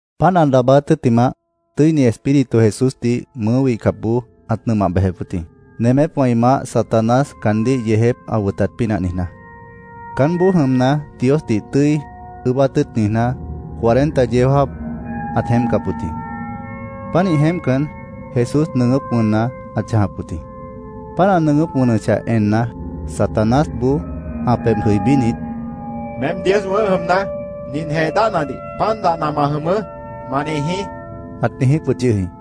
Páant ã daabáát tʉ́ttimah, Tʉ́ini Espíritu Jesúsdih mʉʉ́ wihcapboó ãt nʉmah bejep wʉt jĩ, nemépwã ĩ maáh, Satanás, caandíh yeejép ã wʉtat pínah niijná. Caánboó jʉmna, Diosdih tʉ́i ʉʉ́bát tʉ́ʉt niijná, cuarenta yeó jáap ãt jeémpcap wʉt jĩ. Pánih jeémpcan, Jesús nʉʉgʉ́p wʉnna ãt chãjap wʉt jĩ. Páant ã nʉʉgʉ́p wʉnʉchah enna, Satanásboó ã pebhna jʉibínit, —Meém Dios wʉ̃ʉ́h jʉmna, nin jee dáhnadih ‘Pan dahna ma jʉmʉʉ́’, ma niijí, ãt niijíp wʉt yʉh jĩ.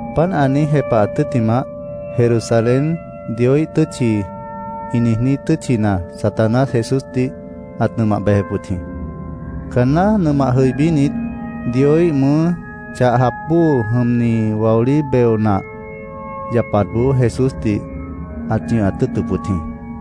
Páant ã niíj jepahat tʉ́ttimah, Jerusalén, “Dioíh tʉ́tchi”, ĩ niijní tʉ́tchina Satanás Jesúsdih ãt nʉmah bejep wʉt jĩ. Caanná nʉmah jʉibínit, Dioíh mʉʉ́ chah jap bóo jʉmni waolí beo nah yapatboó Jesúsdih ãt ñʉhat tʉ́ʉtʉp wʉt jĩ.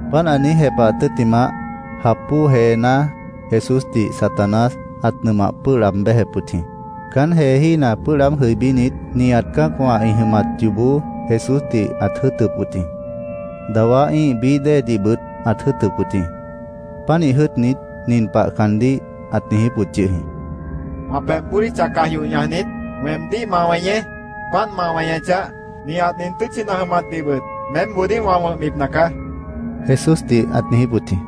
Páant ã niíj jepahat tʉ́ttimah, jap bóo jeená Jesúsdih Satanás ãt nʉmah pʉ́ʉh laab béjep wʉt jĩ. Caán jeejína pʉ́ʉh laáb jʉibínit, nihat cã́acwã ĩ jʉmat yoobó Jesúsdih ãt jʉ́ʉtʉp wʉt jĩ. Dawá ĩ́ih bií déedihbʉt ãt jʉ́ʉtʉp wʉt jĩ. Pánih jʉ́ʉtnit, nin pah caandíh ãt niijíp wʉt yʉh jĩ: —Wã pebh bódicha caj yoh ñajnit, weemdíh ma weñeé. Páant ma weñechah, nihat nin tʉ́tchina ã jʉmatdihbʉt meémboodíh wã wʉ̃hbipna caá, Jesúsdih ãt niijíp wʉt jĩ.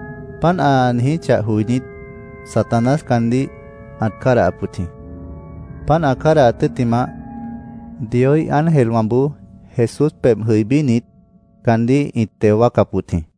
Páant ã niijíchah joinít, Satanás caandíh ãt cádahap wʉt jĩ. Páant ã cádahat tʉ́ttimah, Dioíh ángelwãboó Jesús pebh jʉibínit, caandíh ĩt teo wáacap wʉt jĩ.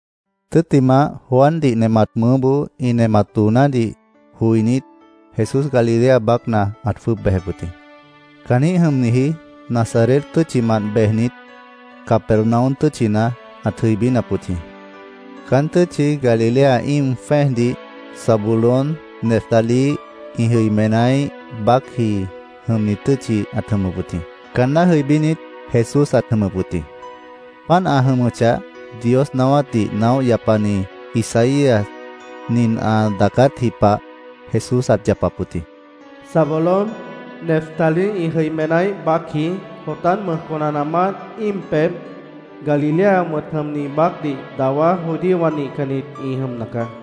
Tʉ́ttimah, Juandih nemat mʉʉ́boó ĩ nemat doonádih joinít, Jesús Galilea baácna ãt jwʉ́ʉb bejep wʉt jĩ. Caanjĩ́h jʉmniji Nazaret tʉ́tchimant bejnit, Capernaum tʉ́tchina ãt jʉibínap wʉt jĩ. Caán tʉ́tchi Galilea íim jwẽ́ejdih Zabulón, Neftalí ĩ jʉimenáíh baácji jʉmni tʉ́tchi ãt jʉmʉp wʉt jĩ. Caanná jʉibínit, Jesús ãt jʉmʉp wʉt jĩ. Páant ã jʉmʉchah, Dios naáwátdih naóh yapani Isaías nin ã daacátji pah Jesús ãt yapap wʉt jĩ: “Zabulón, Neftalí ĩ jʉimenáíh baácji, Jordán mʉj conanaamánt, íim pebh, Galilea wʉ̃t jʉmni baácdih dawá judíowã nihcannit ĩ jʉmna caá.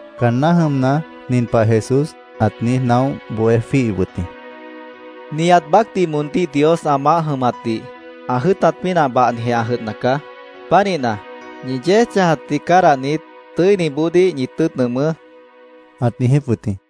Caanná jʉmna, nin pah Jesús ãt niíj naóh bohé jwíihip wʉt jĩ: “Nihat baácdih moondíh Dios ã maáh jʉmatdih ã jʉ́ʉtat pínah bahnijeh ã jʉdhna caá. Pánihna, ñi yéej chãjatdih cádahnit, tʉ́iniboodíh ñi tʉ́ʉt nʉʉmʉ́”, ãt niijíp wʉt jĩ.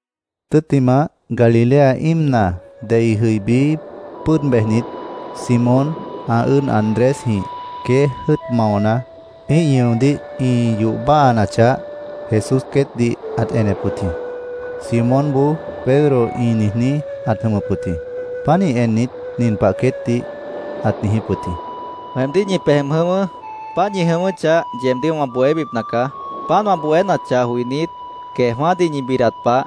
Tʉ́ttimah, Galilea íimna dei jʉibí, pʉ́ʉd bejnit, Simón, ã ʉ́ʉd Andrésjĩh queéj jʉ́ʉt maona, ĩ́ih ñʉodíh ĩ yoh báhanachah, Jesús queétdih ãt enep wʉt jĩ. Simónboó Pedro ĩ niijní ãt jʉmʉp wʉt jĩ. Pánih ennit, nin pah queétdih ãt niijíp wʉt jĩ: —Weemdíh ñi pej jʉm jʉ̃ʉ́wʉ́. Páant ñi jʉ̃ʉ́wʉ́chah, yeebdíh wã bohébipna caá. Páant wã bohénachah joinít, queejwã́dih ñi bidat pah,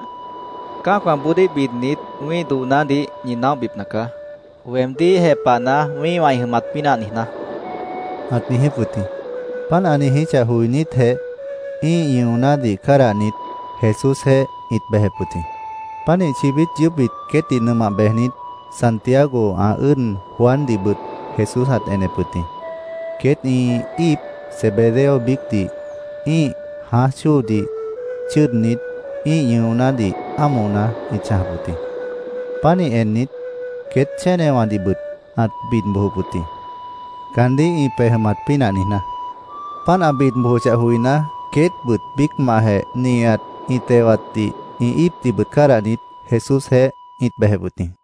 cã́acwãboodíh bidnit, wĩ́ih doonádih ñi naóhbipna caá, weemdíh jepahna, wĩ́ihwã ĩ jʉmat pínah niijná, ãt niijíp wʉt jĩ. Páant ã niijíchah joinítjeh, ĩ́ih ñʉonádih cádahnit, Jesúsjeéh ĩt bejep wʉt jĩ. Pánih chibít yʉʉ́p queétdih nʉmah bejnit, Santiago ã ʉ́ʉd Juandihbʉt Jesús ãt enep wʉt jĩ. Queét ĩ íip Zebedeo biícdih ĩ́ih jãáj chóodih chʉ́ʉdnit, ĩ́ih ñʉonádih ámohna ĩt chãjap wʉt jĩ. Pánih ennit, queét chénewãdihbʉt ãt bid bojop wʉt jĩ, caandíh ĩ pej jʉmat pínah niijná. Páant ã bid bojochah joiná, queétbʉt biícmantjeh nihat ĩ tewatdih, ĩ íipdihbʉt cádahnit, Jesúsjeéh ĩt bejep wʉt jĩ.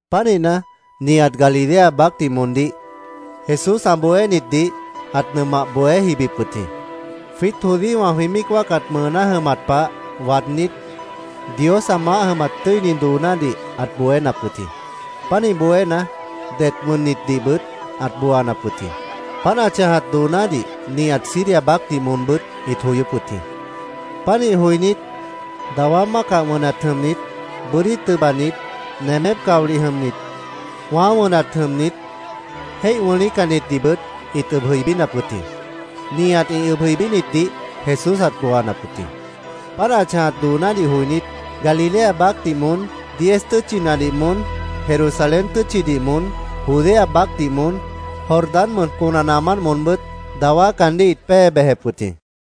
Pánihna, nihat Galilea baácdih moondíh Jesús ã bohénitdih ãt nʉmah bohé jibip wʉt jĩ. Jwiít judíowã jwĩ míic wáacat mʉʉná jʉmat pah waadnít, Dios ã maáh jʉmat tʉ́ini doonádih ãt bohénap wʉt jĩ. Pánih bohéna, det wʉnnitdihbʉt ãt booanap wʉt jĩ. Páant ã chãjat doonádih nihat Siria baácdih moonbʉ́t ĩt joyóp wʉt jĩ. Pánih joinít, dawá mácah wʉnat jʉmnit, bʉ́dí tʉbanit, nemép caolih jʉmnit, wãá wʉnat jʉmnit, jéih wʉ̃lícannitdihbʉt ĩt ʉb jʉibínap wʉt jĩ. Nihat ĩ ʉb jʉibínitdih Jesús ãt booanap wʉt jĩ. Páant ã chãjat doonádih joinít, Galilea baácdih moón, Diez Tʉ́tchinadih moón, Jerusalén tʉ́tchidih moón, Judea baácdih moón, Jordán mʉj conanaamánt moonbʉ́t dawá caandíh ĩt pée bejep wʉt jĩ.